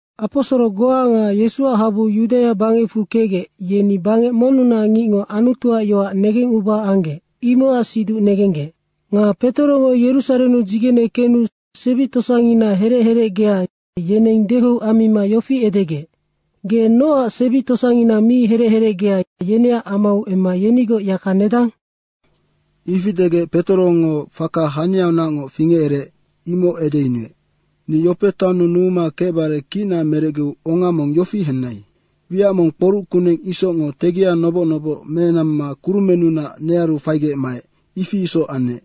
Aposoro goa nga Yesuac habu Yudaia bangecfu kecgec, yeni bangec monnunac ngicngo Anutuac yoac negenguba anggec, imocac siduc negenggec. Nga Petorongo Yerusarennu dzigene kenu sebi tosangina herec herecgea, yeneng dehou ammima yofi edegec, “Ge nocac sebi tosangina mi herec herecgea, yeneac amau emma yenigoc yaka nedang?” Ifi degec Petorongo faka haniaunacngoc fingecereec, imoc edeyunuec. “Ni Yope taonnu numuma kecbare kicna merecgeu onga mong yofi henai: Wiac mong kporuc kuneng isocngo tegia noboc noboc menamma kurumennunac nearu faigec maec, ifi isoc anec.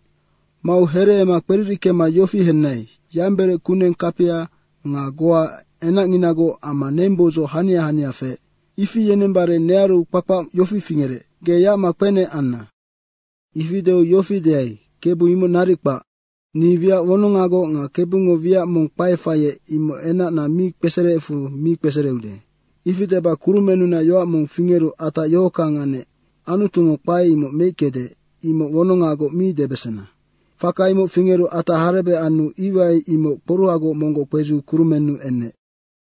Mau hereema kperirickema yofi henai, yamberec kuneng kapia nga goa enacnginagoc amma nengboudzoc hania hania feec. Ifi yenembare nearu kpakpac yofi fingerec, ‘Ge yacma kpenec anna.’ Ifi deu yofi deai, ‘Kebu imoc naric kpac. Ni wiac wonongagoc nga Kebungo wiac mong kpae faiec, imoc enacna mi kpesereecfu mi kpesereude.’ Ifi deba kurumennunac yoac mong fingeru atac yohockang anec, ‘Anutungo kpae imoc meickede, imoc wonongagoc mi debesena.’ Faka imoc fingeru atac harebec anu iwai imoc kporuhagoc monggoc kpedziu kurumennu enec.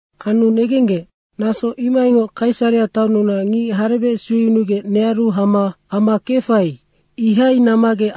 Anu negenggec, naso imohaingoc Kaisarea taonnunac ngic harebec sueyunugec nearu hama ama kefai, ihai nammaggec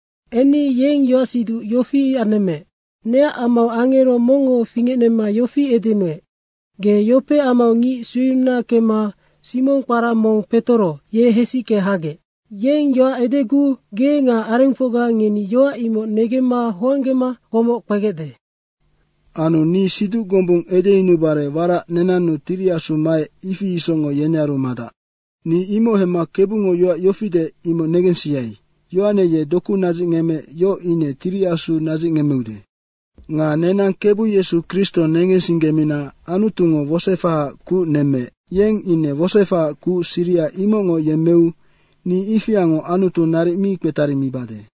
Enni yeng yoacsiduc yofi anemmeec, ‘Neac amau angero mongngo fingecnemma yofi edenuec, “Ge Yope amau ngic sueyununa kemma Simong kpara mong Petoro, ye hesicke hagec. Yeng yoac edeguu ge nga arengfocga ngeni yoac imoc negemma hoanggema komoc kpegecde.” ’ Anu ni siduc gombung edeyunubare warac nenannu Tiri Asu maec, ifi isocngoc yenearu madac. Ni imoc hemma Kebungo yoac yofi deec, imoc negensiai, ‘Yohane ye doku nadzicngemmeec, yoc ine Tiri Asu nadzicngemmeude.’ Nga nenang Kebu Yesu Kristo negensinggemina Anutungo wosoefahaac kuc nemmeec, yeng ine wosoefahaac kuc siriha imocngoc yemmeu ni ifiango Anutu naric mi kpetarimibade.”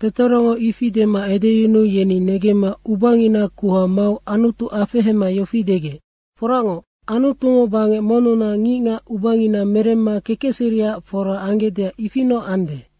Petorongo ifi dema edeyunuu yeni negemma ubangina kuha mau Anutu afehema yofi degec, “Foracngoc, Anutungo bangec monnunac ngicngac ubangina meremma kekecseriac fora anggecdeac ifinoc ande.”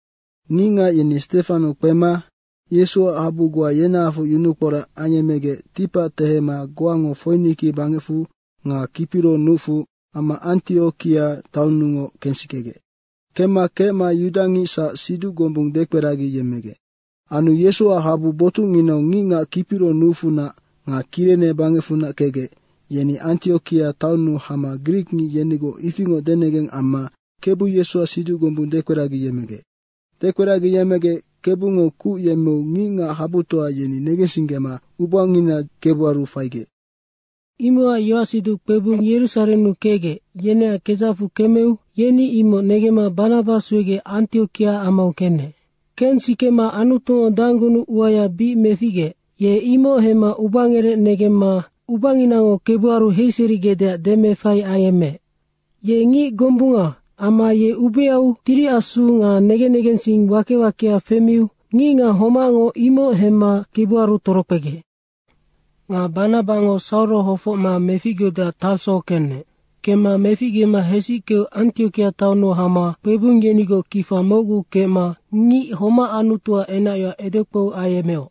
Ngicngac yeni Stefano kpema Yesuac habu goa yenahafoc yunukporac ayemmegec ticpac tehema goango Foiniki bangecfu nga Kipiro nucfu amma Antiokia taonnungoc kensikegec. Kemma kecma yudangicsac siduc gombung dekperagiyemmegec. Anu Yesuac habu botucnginau ngicngac Kipiro nucfunac nga Kirene bangecfunac kecgec, yeni Antiokia taonnu hama grikngic yenigoc ifingoc denegeng amma Kebu Yesuac siduc gombung dekperagiyemmegec. Dekperagiyemmegec Kebungo kuc yemmeu ngicngac habutoa yeni negensinggema ubangina Kebuaru faigec. Imocac yoacsiduc kpebung Yerusarennu kecgec, yeneac kedzacfu kemeu yeni imoc negemma Banaba suegec Antiokia amau kenec. Kensikema Anutungo danggunuc uaya bic meficgeec, ye imoc hemma ubangerec negemma ubanginango Kebuaru heiserigecdeac demeefai ayemmeec. Ye ngic gombunga amma ye ubeau Tiri Asu nga negen negensing wake wakea femiu ngicngac homacngo imoc hemma Kebuaru torokpegec. Nga Banabango Sauro hofocma meficgeudeac Tarso kenec. Kemma meficgema hesickeu Antiokia taonnu hama kpebung yenigoc kifa mocgu kecma ngic homac Anutuac enacyoac edekpou ayemmeoc.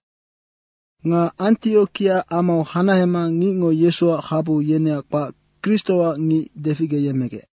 Nga Antiokia amau hanahema ngicngo Yesuac habu, yeneac kpac Kristoac ngic deficgeyemmegec.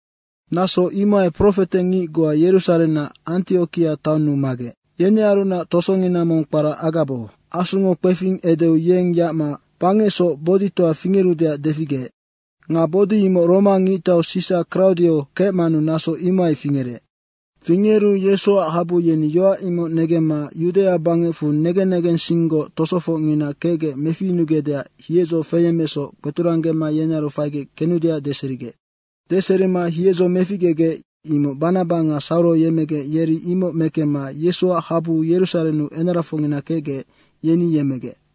Naso imohai profetengic goa Yerusarennac Antiokia taonnu magec. Yenearunac tosongina mong kpara Agabo. Asungo kpefing edeu yeng yacma bangecsoc boditoa fingerudeac deficgeec. Nga bodi imoc Roma ngictau Sisa Kraudio kecmanu naso imohai fingerec. Fingeru Yesuac habu yeni yoac imoc negemma Yudaia bangecfu negen negensinggoc tosofocngina kecgec meficyunugecdeac hiedzo feyemmeecsoc kpeturanggema yenearu faigec kenudeac deserigec. Deserima hiedzo meficgegec, imoc Banaba nga Sauro yemecgec yeri imoc mekemma Yesuac habu Yerusarennu enarafocngina kecgec, yeni yemmegec.